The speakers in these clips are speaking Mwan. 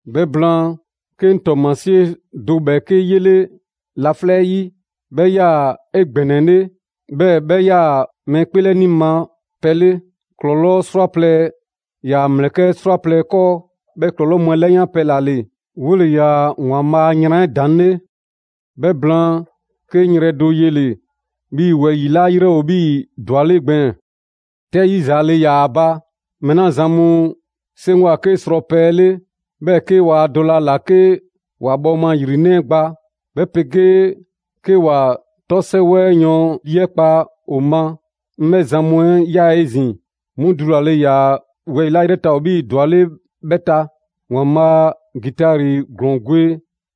'Bhɛ blaan, 'ke 'ŋ ‑tɔɔmasie do ‑bhɛɛke' 'yele laflɛ' 'ɛ 'yi, 'bhɛ 'yaa‑ 'egbɛnɛle, 'bhɛɛ‑ 'bhɛ 'yaa‑ mɛɛ 'kpeelɛni ma pɛ 'le: ‑klɔlɔɔ' 'srwaplɛ‑ ‑yaa ‑mlɛkɛ' 'srwaplɛ‑ 'kɔɔ. 'Bhɛ ‑klɔlɔɔ' mu 'ɛ 'yaa‑ 'ke ‑klɔlɔɔ' mu 'ɛ 'lɛyanpɛ ‑la ‑le. 'Wole‑ ‑yaa ‑Waanbhaa' a yran 'ɛ ‑daŋ' 'le. 'Bhɛ blaan, 'ke 'ŋ yrɛ do yele‑ 'bhii‑ wɛyi‑ 'la 'yrɛ ‑o 'bhii‑ ‑dwaleŋ' gbɛɛn‑; 'tɛ 'yizaale ‑yaa ‑a ba. Mɛɛ 'la zan mu 'seŋgwa‑ 'ke srɔpɛ 'ɛ 'le, 'bhɛɛ‑ 'ke ‑waa dɔlɛ ‑a ‑la 'ke ‑wa ‑bhɔɔma ‑yrinɛ' 'ɛ gba, 'bhɛ 'pegee 'ke ‑wa 'tɔ 'sɛwɛ 'ɛ yɔɔn ‑lii 'ɛ kpa ‑o ma, 'ŋ 'bhɛ zan mu 'ɛ ꞊ya 'ezin‑. 'Mu dulale ‑yaa wɛyi‑ 'la 'yrɛ ta ‑o 'bhii‑ ‑dwaleŋ' 'bhɛ ta; ‑Waanbhaa' ‑gitari ‑glɔɔn gwe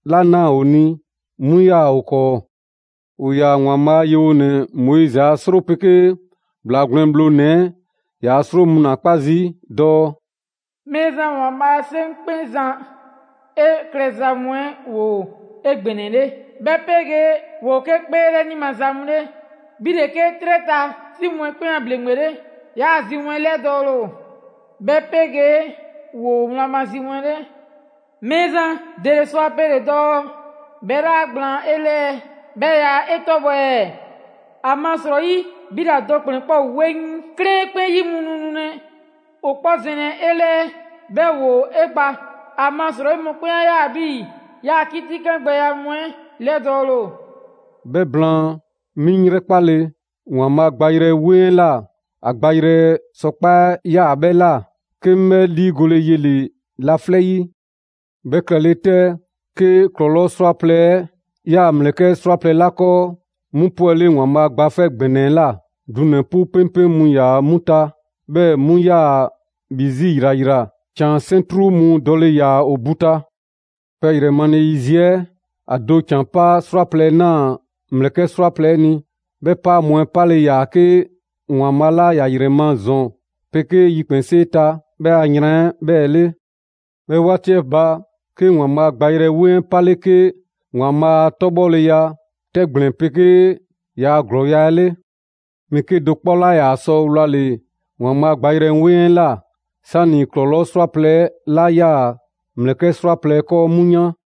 'la ꞊naa ‑o ni, 'mu ‑yaa ‑o 'kɔɔ. ‑O ‑yaa ‑Waanbhaa' a yewonɛ Moizi a 'sro 'pegee ‑Bhlaa Gwlɛn Bhlonɛ‑ 'ɛ ‑yaa' 'sro mu 'kpa zii' dɔɔ: «Mɛɛzan ‑Waanbhaa' 'Seŋkpɛnzan, 'e klɛza mu 'ɛ ‑woo 'egbɛnɛle, 'bhɛ 'pegee ‑woo 'ke 'kpeelɛni maza mu 'le! 'Bhi ‑le 'ke 'trɛ ta 'si mu 'ɛ 'kpɛn a ‑bhleŋgbe 'le, 'yaa‑ zi mu 'ɛ 'lɛdɔɔle ‑o, 'bhɛ 'pegee ‑woo wlan ma zi mu 'le! Mɛɛzan, ‑dele sɔ a pele‑ dɔɔ 'bhɛ 'laa gblaan 'e 'lɛɛ, 'bhɛɛ‑ yaa 'e 'tɔbhɔ‑ ɛɛ? ‑Amasrɔyi, 'bhi ‑la do ‑kplɛn 'kpɔ ‑o 'weŋ, 'klɛɛn 'ɛ 'kpɛn yi mu nu nulɛ ‑o 'kpɔ zɛnlɛ 'e 'lɛɛ, 'bhɛɛ‑ ‑woo 'e gba. ‑Amasrɔyi mɔkpɛn' 'a ꞊ya 'bhii‑ 'yaa‑ 'kitikangbɛya mu 'ɛ 'lɛdɔɔle ‑o.» 'Bhɛ blaan, 'mi 'ŋ 'yrɛkpale, ‑Waanbhaa' gbayrɛ 'weŋ 'la ‑a gbayrɛ sɔkpaa' 'ɛ 'yaa‑ 'bhɛ ꞊la, 'ke 'ŋ 'bhɛ 'liigole yele‑ laflɛ' 'yi. 'Bhɛ klɛle 'tɛ, 'ke ‑klɔlɔɔ' 'srwaplɛ‑ 'ɛ 'yaa‑ ‑mlɛkɛ' 'srwaplɛ‑ 'la 'kɔɔ, 'mu 'pwɛle ‑Waanbhaa' Gba 'Fɛ ‑Gbɛnɛ 'ɛ ꞊la; dunɛ‑ 'pu 'peŋpeŋ mu ‑yaa 'mu ta, 'bhɛɛ‑ 'mu 'yaa‑ bhi 'zi ‑yrayra. ‑Can 'sɛntru mu dɔle ‑yaa ‑o ‑bu ta. Pɛ ‑yrɛ male yiziɛ 'ɛ, ‑a do ‑can 'paa 'srwaplɛ‑ ‑naa ‑mlɛkɛ' 'srwaplɛ‑ 'ɛ ni. 'Bhɛ 'paa mu 'ɛ 'pale‑ ‑yaa 'ke ‑Waanbhaa' 'la ‑ya ‑yrɛ ma ‑zɔn 'pegee yikpɛnsee ta 'bhɛ a yran 'ɛ 'bhɛɛ‑ 'le. 'Bhɛ 'waati 'ɛ ba, 'ke ‑Waanbhaa' gbayrɛ 'weŋ 'ɛ 'pale 'ke ‑Waanbhaa' a 'tɔbhɔleya 'tɛgblɛn‑ 'pegee ‑yaa' ‑glɔɔya' 'ɛ 'le. Mɛɛ 'kedo‑ 'kpɔ 'laa ‑yaa sɔ wlale‑ ‑Waanbhaa' gbayrɛ 'weŋ 'ɛ ꞊la, 'sani‑ ‑klɔlɔɔ' 'srwaplɛ‑ 'la 'yaa‑ ‑mlɛkɛ' 'srwaplɛ‑ 'ɛ 'kɔɔ 'mu yan.